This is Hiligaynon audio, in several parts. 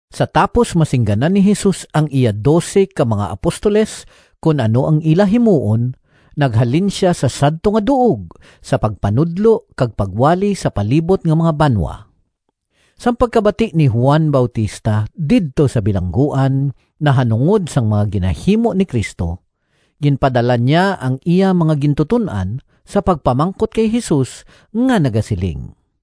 Sa tapos masingganan ni Jesus ang iya dose ka mga apostoles kon ano ang ila himuon naghalin sia sa sadto nga duog sa pagpanudlo kag pagwali sa palibot nga mga banwa. Sang pagkabati ni Juan Bautista didto sa bilangguan, nahanungod sang mga ginahimo ni Cristo, ginpadala niya ang iya mga gintuton-an sa pagpamangkot kay Jesus nga nagasiling,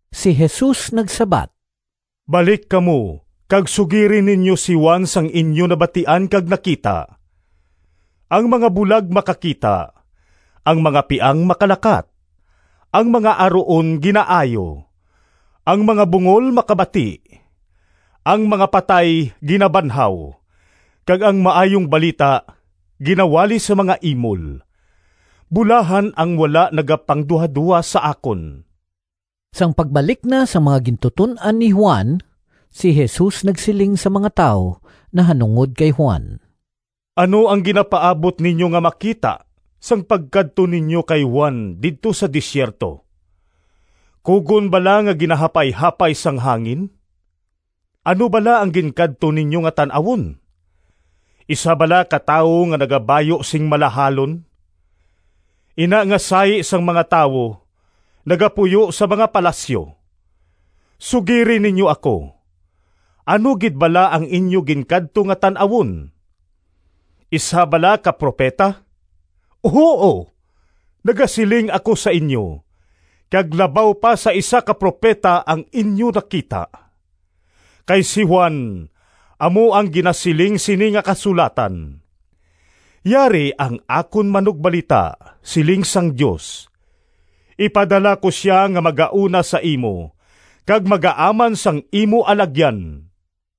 Si Jesus nagsabat, “Balik kamo kag sugiri ninyo si Juan sang inyo nabatian kag nakita: ang mga bulag makakita, ang mga piang makalakat, ang mga aruon ginaayo, ang mga bungol makabati, ang mga patay ginabanhaw, kag ang Maayong Balita ginawali sa mga imol. Bulahan ang wala nagapangduhadoha sa akon!” Sang pagbalik na sang mga gintuton-an ni Juan, si Jesus nagsiling sa mga tawo nahanungod kay Juan, “Ano ang ginapaabot ninyo nga makita sang pagkadto ninyo kay Juan didto sa desierto? Kugon bala nga ginahapayhapay sang hangin? Ano bala ang ginkadto ninyo nga tan-awon? Isa bala ka tawo nga nagabayu sing malahalon? Ina nga sahi sang mga tawo nagapuyo sa mga palasyo! Sugiri ninyo ako, ano gid bala ang inyo ginkadto nga tan-awon? Isa bala ka propeta? Huo, nagasiling ako sa inyo, kag labaw pa sa isa ka propeta ang inyo nakita. Kay si Juan amo ang ginasiling sini nga kasulatan: ‘Yari ang akon manugbalita, siling sang Dios; ipadala ko sia nga magauna sa imo kag magaaman sang imo alagyan.’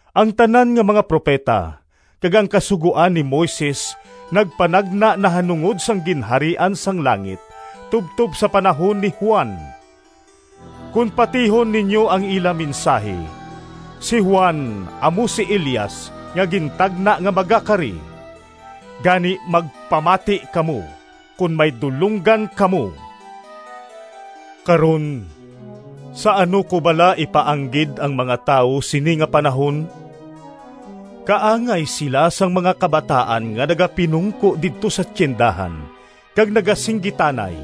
Ang tanan nga mga propeta, kag ang Kasugoan ni Moises nagpanagna nahanungod sang Ginharian sang langit tubtob sa panahon ni Juan. Kon patihon ninyo ang ila mensahi, si Juan amo si Elias nga gintagna nga magakari. Gani, magpamati kamo kon may dulonggan kamo! “Karon, sa ano ko bala ipaanggid ang mga tawo sini nga panahon? Kaangay sila sang mga kabataan nga nagapinungko didto sa tiyendahan kag nagasinggitanay,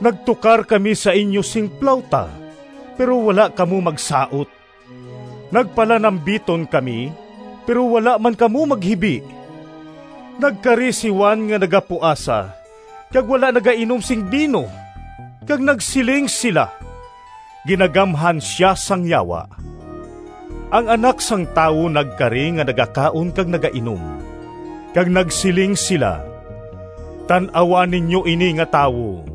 ‘Nagtukar kami sa inyo sing plawta, pero wala kamo magsaot! Nagpanalambiton kami, pero wala man kamo maghibi!’ Nagkari si Juan nga nagapuasa kag wala nagainom sing bino, kag nagsiling sila, ‘Ginagamhan sia sang yawa!’ Ang Anak sang Tawo nagkari nga nagakaon kag nagainom, kag nagsiling sila, ‘Tan-awa ninyo ini nga tawo!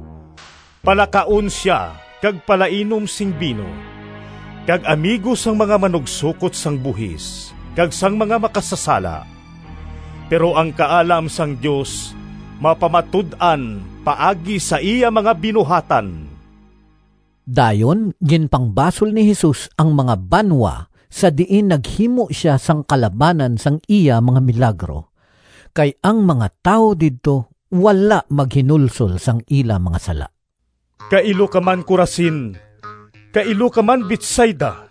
Palakaon sia kag palainom sing bino, kag amigo sang mga manugsokot sang buhis kag sang mga makasasala!’ Pero ang kaalam sang Dios mapamatud-an paagi sa iya mga binuhatan.” Dayon ginpangbasol ni Jesus ang mga banwa sa diin naghimo sia sang kalabanan sang iya mga milagro kay ang mga tawo didto wala maghinulsol sang ila mga sala. “Kailo ka man Corazin! Kailo ka man Betsaida!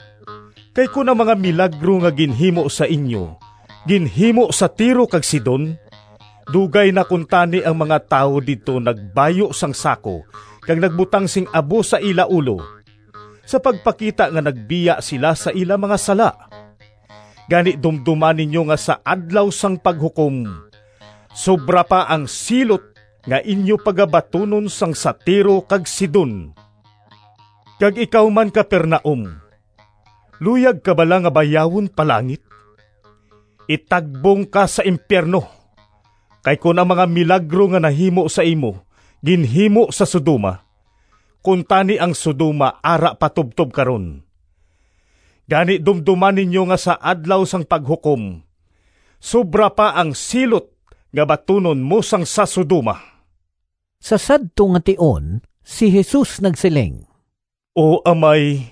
Kay kon ang mga milagro nga ginhimo sa inyo ginhimo sa Tiro kag Sidon, dugay na kuntani ang mga tawo didto nagbayu sang sako kag nagbutang sing abo sa ila ulo sa pagpakita nga nagbiya sila sa ila mga sala! Gani dumdoma ninyo nga sa Adlaw sang Paghukom, sobra pa ang silot nga inyo pagabatunon sang sa Tiro kag Sidon. Kag ikaw man Capernaum luyag ka bala nga bayawon pa langit? Itagbong ka sa impiyerno! Kay kon ang mga milagro nga nahimo sa imo ginhimo sa Sodoma, kuntani ang Sodoma ara pa tubtob karon! Gani, dumdoma ninyo nga sa Adlaw sang Paghukom sobra pa ang silot nga batunon mo sang sa Sodoma!” Sa sadto nga tion si Jesus nagsiling, “O Amay,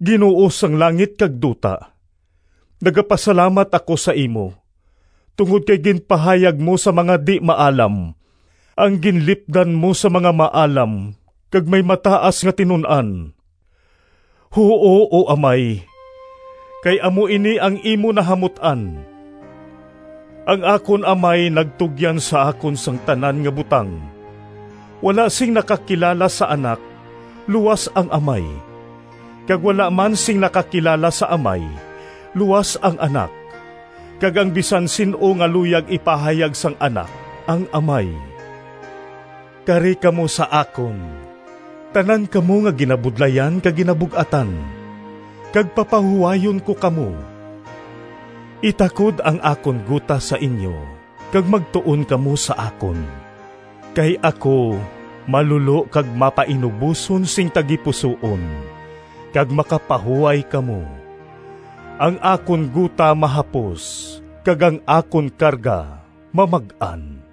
Ginoo sang langit kag duta! Nagapasalamat ako sa imo tungod kay ginpahayag mo sa mga di-maalam, ang ginlipdan mo sa mga maalam kag may mataas nga tinun-an. Huo, O Amay, kay amo ini ang imo nahamut-an. “Ang akon Amay nagtugyan sa akon sang tanan nga butang. Wala sing nakakilala sa Anak luas ang Amay, kag wala man sing nakakilala sa Amay luas ang Anak kag ang bisan sin-o nga luyag ipahayag sang Anak ang Amay. “Kari kamo sa akon, tanan kamo nga ginabudlayan kag ginabug-atan, kag papahuwayon ko kamo. Itakod ang akon gota sa inyo kag magtuon kamo sa akon, kay ako malulo kag mapainuboson sing tagipusoon, kag makapahuway kamo. Ang akon gota mahapos, kag ang akon karga mamag-an.”